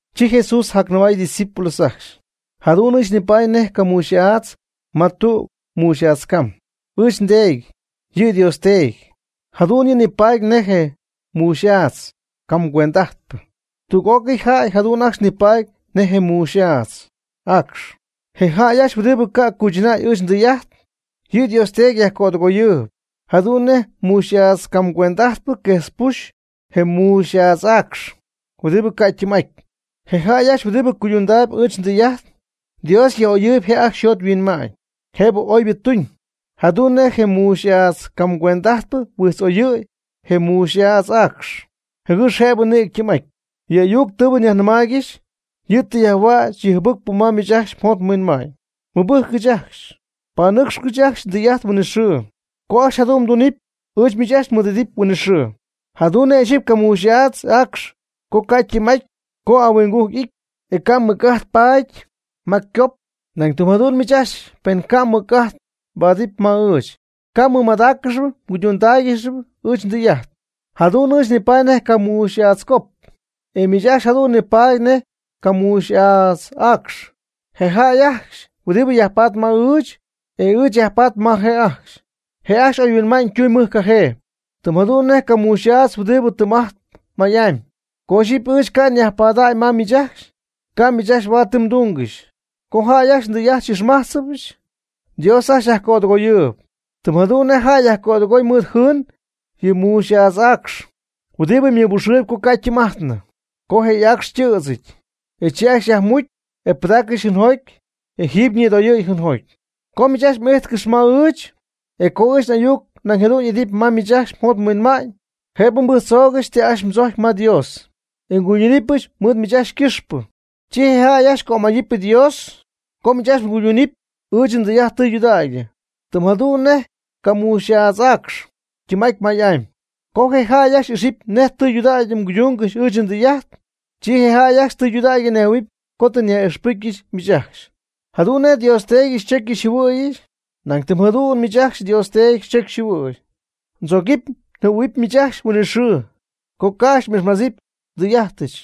Chi Jesús jacnɨmay ydiscípulos ajcxy: ―Jadu'n ɨɨch nipaady nej camuux'aadz ma tüg muuxy'aadz cam. Ɨɨch nDeedy, yɨ Dios Teedy, jadu'n yɨ' nipaady nej je muuxy'aadz cam cuend'ajtpɨ. Tüg'ócɨy jäy jadu'n ajcxy nipaady nej muuxy'aadz y'aacx. Je jäy ajcxy huɨdibɨ ca' cuychɨnäy ɨɨch ndɨy'ajt, yɨ Dios Teedy yajcödɨgoyɨɨb, jadu'n nej je muuxy'aadz cam cuend'ajtpɨ quejtzpuxy je muuxy'aadz y'aacx huɨdibɨ ca' ytɨɨm'aty. Je jäy ajcxy huɨdibɨ cuydundaayb ɨɨch ndɨy'ajt, Dios yaj'oyɨɨb je' ajcxy yjot yhuinma'ñ, jëbɨ oybɨ tuñ, jadu'n nej je muuxy'aadz cam cuend'ajtpɨ huijtz'oyɨ̈y je muuxy'aadz y'aacx, jɨgɨx jëbɨ nïgɨ ytɨɨm'aty. Yɨ ayuc huɨdibɨ tɨ nyajnɨmaaygɨxy, yɨ' tɨ yajhuäch yɨ jɨbɨcpɨ ma miich ajcxy mjot mhuinma'ñ. Mɨbɨjccɨch ajcxy, panɨ́cxɨgɨch ajcxy ndɨy'ajt huinɨxɨɨ. Co ajcxy jadu'n mdunɨpy, ɨɨch miich ajcxy mɨɨd'idɨpy huinɨxɨɨ. Jadu'n nej ixyipy camuuxy'aadz y'aacx co ca' ytɨɨm'aty co ahuinggujc y'ity, e ca' mɨc'ajt paady ma ycop. Nañ tɨm jadu'n miich ajcxy pen ca' mmɨc'ajt mbaadɨpy ma ɨɨch, ca' mmɨmadáaccɨxɨpy mguychɨnáaygɨxɨpy ɨɨch ndɨy'ajt. Jadu'n ɨɨch nipaady nej camuuxy'aadz cop, e miich ajcxy jadu'n nipaady nej camuuxy'aadz y'aacx. Je jäy ajcxy huɨdibɨ yajpatp ma ɨɨch, e ɨɨch nyajpaady ma je' ajcxy, je' ajcxy oyhuinma'ñ tunam mɨj cajee, tɨm jadu'n nej camuuxy'aadz huɨdibɨ tɨɨm'ajtp may'amy. Co ixyipy ɨɨch ca' nyajpaady ma miich ajcxy, ca' miich ajcxy huaad ti mdungɨxy. Co jäy ajcxy ndɨy'ajt xy'ixmájtzɨbɨch, Dios ajcxy yajcödɨgoyɨɨb, tɨm jadu'n nej jäy yajcödɨgoy mɨɨd jɨɨn yɨ muuxy'aadz y'aacx huɨdibɨ ymɨbuxɨɨyb co ca' ytɨɨm'ajtnɨ. Co je y'aacx ytɨ̈dzɨty, chi ajcxy yajmucy, e pɨdaaccɨxy jɨɨnjoty, e jadu'n jiiby ñïdoyɨ̈y jɨɨnjoty. Co miich ajcxy m'ijtcɨxy ma ɨɨch, e co ɨɨch n'ayuc nañ jadu'n ijtp ma miich ajcxy mjot mhuinma'ñ, jëbɨ mbɨjctzoogɨxy ti ajcxy mdzojcyp ma Dios, e nguydunɨpyɨch mɨɨd miich ajcxy ycɨxpɨ. Chi je jäy ajcxy cömayɨpy Dios co miich ajcxy mguydunɨpy ɨɨch ndɨy'ajt tɨydudägy, tɨm jadu'n nej camuuxy'aadz y'aacx ytɨɨm'aty may'amy. Co je jäy ajcxy ixɨpy nej tudägy mguydungɨxy ɨɨch ndɨy'ajt, chi je jäy ajcxy tɨydudägy nejhuɨ̈huɨpy co tɨ nyaj'ixpɨcyɨch miich ajcxy. Jadu'n nej Dios Teedy xychocyɨch xyjɨhuɨ̈yɨch, nañ tɨm jadu'n ɨɨch miich ajcxy tɨ ndzocy tɨ njɨhuɨ̈yɨch. Ndzogɨpy njɨhuɨ̈huɨbyɨch miich ajcxy huinɨxɨɨ co ca' ajcxy xy'ixmájtzɨbyɨch ndɨy'ajtɨch.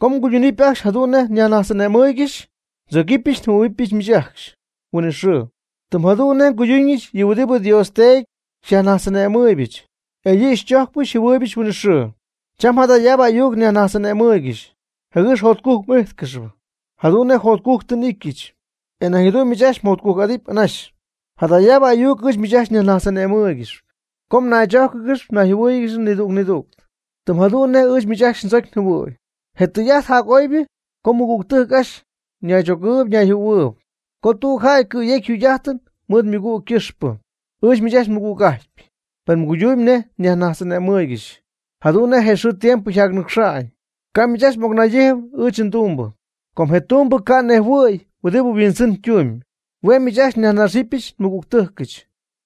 Co mguydundähuɨpy ajcxy jadu'n nej nyajnajtz'ane'mɨɨygɨxy, ndzogɨpyɨch njɨhuɨ̈huɨbyɨch miich ajcxy huinɨxɨɨ. Tɨm jadu'n nej nguyduñɨch yɨ huɨdibɨ Dios Teedy xyajnajtz'ane'mɨɨybɨch, e yɨ' xychojcpɨch xyjɨhuɨɨybɨch huinɨxɨɨ. Cham jadayaabɨ ayuc nyajnajtz'ane'mɨɨygɨxy, jɨgɨx jotcujc m'ijtcɨxɨpy. Jadu'n nej jotcujc tɨ n'ityɨch, e nañ jadu'n miich ajcxy mjotcujc'adɨpy anaxy. Jadaabɨ ayuc ɨɨch miich ajcxy nyajnajtz'ane'mɨɨybɨch co naychójcɨgɨx nayjɨhuɨ́ɨyɨgɨx nidüg nidüg, tɨm jadu'n nej ɨɨch miich ajcxy ndzocy njɨhuɨ̈y. Je tɨy'ajt jac'oybɨ co mɨgügtɨjc ajcxy naychogɨɨyb nayjɨhuɨ̈huɨɨyb, co tüg jäy cɨ̈yegɨpy yjugy'ajtɨn mɨɨd ymɨgügtɨjc ycɨxpɨ. Ɨɨch miich ajcxy mɨgüg'ajtyp, pen mguydumyb nej ajcxy nyajnajtz'ane'mɨɨygɨxy. Jadu'n nej xɨɨ tiempo yjacnɨcxa'ñ, ca' miich ajcxy n'ocnaydijnɨp ɨɨch ndumbɨ. Com je tumbɨ ca' huinjɨhuɨ̈y huɨdibɨ yhuindzɨn ytumyb. Hue' miich ajcxy nyajnaxyɨch nmɨgügtɨjcɨch,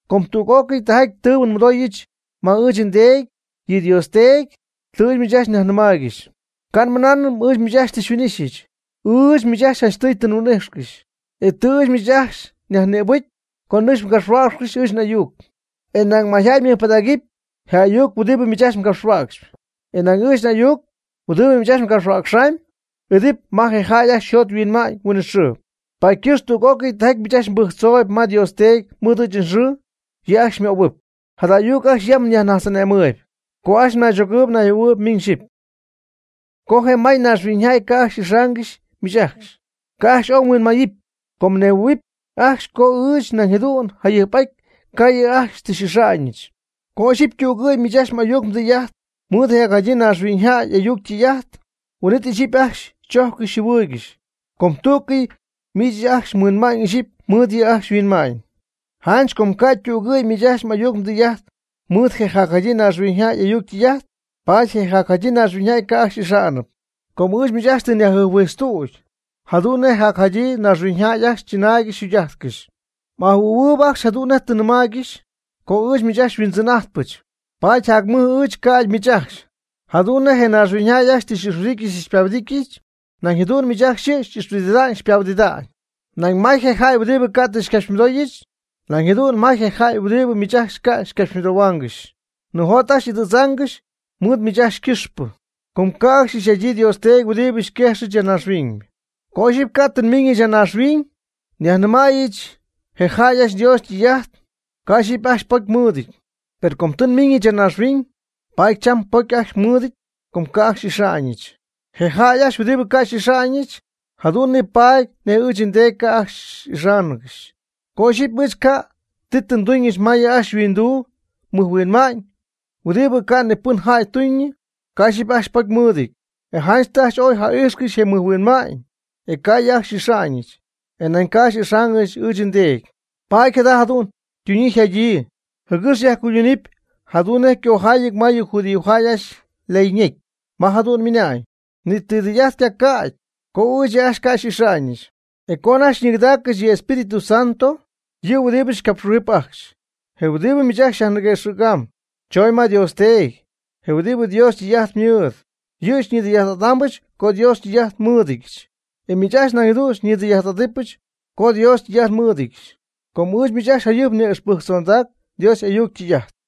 com tüg'ócɨy tɨy'ajt tɨɨbɨ nmɨdooyɨch ma ɨɨch nDeedy, yɨ Dios Teedy, tɨ ɨɨch miich ajcxy nnɨmaaygɨxy. Ca' nmɨnaanɨm ɨɨch miich ajcxy tɨ xyhuin'ixy. Ɨɨch miich janchtɨy ajcxy tɨ nhuin'ixy. E tɨ ɨɨch miich ajcxy nyajnïbɨcy co nɨcxy mgapxhuäcxcɨxy ɨɨch n'ayuc. E nañ mayjäy mɨjpɨdägɨpy je ayuc huɨdibɨ miich ajcxy mgapxhuäcxɨpy. E nañ ɨɨch n'ayuc, huɨdibɨ miich ajcxy mgapxhuäcxɨpy, y'idɨpy ma je jäy ajcxy yjot yhuinma'ñ huinɨxɨɨ. Paady ycɨx tüg'ócɨy tijaty miich ajcxy mbɨjctzooyb ma Dios Teedy mɨɨd ɨɨch nxɨɨ, yɨ' ajcxy xymöhuɨpy. Jada ayuc ajcxy yam nyajnajtz'ane'mɨɨyb co ajcxy mnaychogɨɨyb mnayjɨhuɨ̈huɨɨyb miñ xyɨpy. Co je may naaxhuiñyjäy ca' xy'ixaangɨxy miich ajcxy, ca' ajcxy ooy mhuinmayɨpy, com mnejhuɨɨyb ajcxy co ɨɨch nañ jadu'n jac jayɨjp ca' yɨ' ajcxy tɨ xy'ixáangɨxyɨch. Co ixyipy ytügɨ̈y miich ajcxy m'ayuc mdɨy'ajt mɨɨd je jacjadyii naaxhuiñyjäy y'ayuc ytɨy'ajt, huin'it ixyipy ajcxy xychojccɨxy xyjɨhuɨɨygɨxy, com tú'cɨy miich ajcxy mhuinma'ñ ixyipy mɨɨd yɨ' ajcxy yhuinma'ñ. Janch com co ca' ytügɨ̈y miich ajcxy m'ayuc mdɨy'ajt mɨɨd je jacjadyii naaxhuiñyjäy y'ayuc ytɨy'ajt, paady je jacjadyii naaxhuiñyjäy ca' ajcxy xy'ixa'nɨp. Com ɨɨch miich ajcxy tɨ nyajjɨjphuijtztüdy, jadu'n nej yɨ jacjadyii naaxhuiñyjäy ajcxy chɨnaaygɨxy yjugy'ajtcɨxy. M'ajɨhuɨ̈huɨɨb ajcxy jadu'n nej tɨ nnɨmaaygɨxy co ɨɨch miich ajcxy xyhuindzɨn'ajtpɨch, paady jac mɨj ɨɨch ca'ydɨ miich ajcxy. Jadu'n nej naaxhuiñyjäy ajcxy tɨ xy'ixhuɨdityɨch tɨ xypahuɨdityɨch, nañ jadu'n miich ajcxy yɨ' xy'ixhuɨdida'ñ xypahuɨdida'ñ. Nañ may je jäy huɨdibɨ ca' tɨ xycapxymɨdooyɨch, nañ jadu'n may je jäy huɨdibɨ miich ajcxy ca' xycapxymɨdohuaangɨxy. Nijot ajcxy y'idɨ̈tzaangɨxy mɨɨd miich ajcxy ycɨxpɨ, com ca' ajcxy ixy'adyii Dios Teedy huɨdibɨ xyquejxyɨch ya naaxhuiñ. Co ixyipy ca' tɨ nmiiñɨch ya naaxhuiñ nyajnɨmäyɨch je jäy ajcxy Dios ytɨy'ajt, ca' ixyipy ajcxy pocy mɨɨdɨty. Per com tɨ nmiiñɨch ya naaxhuiñ, paady cham ypocy ajcxy mɨɨdɨty co ca' ajcxy xy'ixa'ñɨch. Je jäy ajcxy huɨdibɨ ca' xy'ixa'ñɨch, jadu'n nipaady nej ɨɨch nDeedy ca' ajcxy ixaangɨxy. Co ixyipy ɨɨch ca' tɨ nduñɨch ma yɨ ajcxy yhuinduu mɨjhuinma'ñ, huɨdibɨ ca' ni pɨn jäy tuñɨ, ca' ixyipy ajcxy pocy mɨɨdɨty. E janch tɨ ajcxy ooy ja'ijxcɨxy je mɨjhuinma'ñ, e ca' ɨɨch yɨ' ajcxy xy'ixa'ñ, e nañ ca' ixaangɨxy ɨɨch nDeedy. Paady jada jadu'n ytuñyii yjadyii, jɨgɨx yajcuydunɨpy jadu'n nej ycojaayɨty ma yɨ judíojäy ajcxy ley ñecy, ma jadu'n ymɨna'ñ: “Ni ti tɨy'ajt ycaca'ty, co ɨɨch yɨ ajcxy ca' xy'ixa'ñɨch.” E co anajty xyñigɨdaaccɨxy yɨ Espíritu Santo, yɨ huɨdibɨ xycapxhuijɨp ajcxy, je huɨdibɨ miich ajcxy nyajniguexam, chon ma Dios Teedy, je huɨdibɨ Dios ytɨy'ajt mɨɨd. Yɨ' xyñidɨy'ajt'adaambɨch co Dios ytɨy'ajt nmɨɨdɨdyɨch. E miich ajcxy nañ jadu'n xyñidɨy'ajt'adɨpɨch co Dios ytɨy'ajt nmɨɨdɨdyɨch. Com ɨɨch miich ajcxy jayɨjp nyaj'ixpɨjctzondac Dios y'ayuc ytɨy'ajt.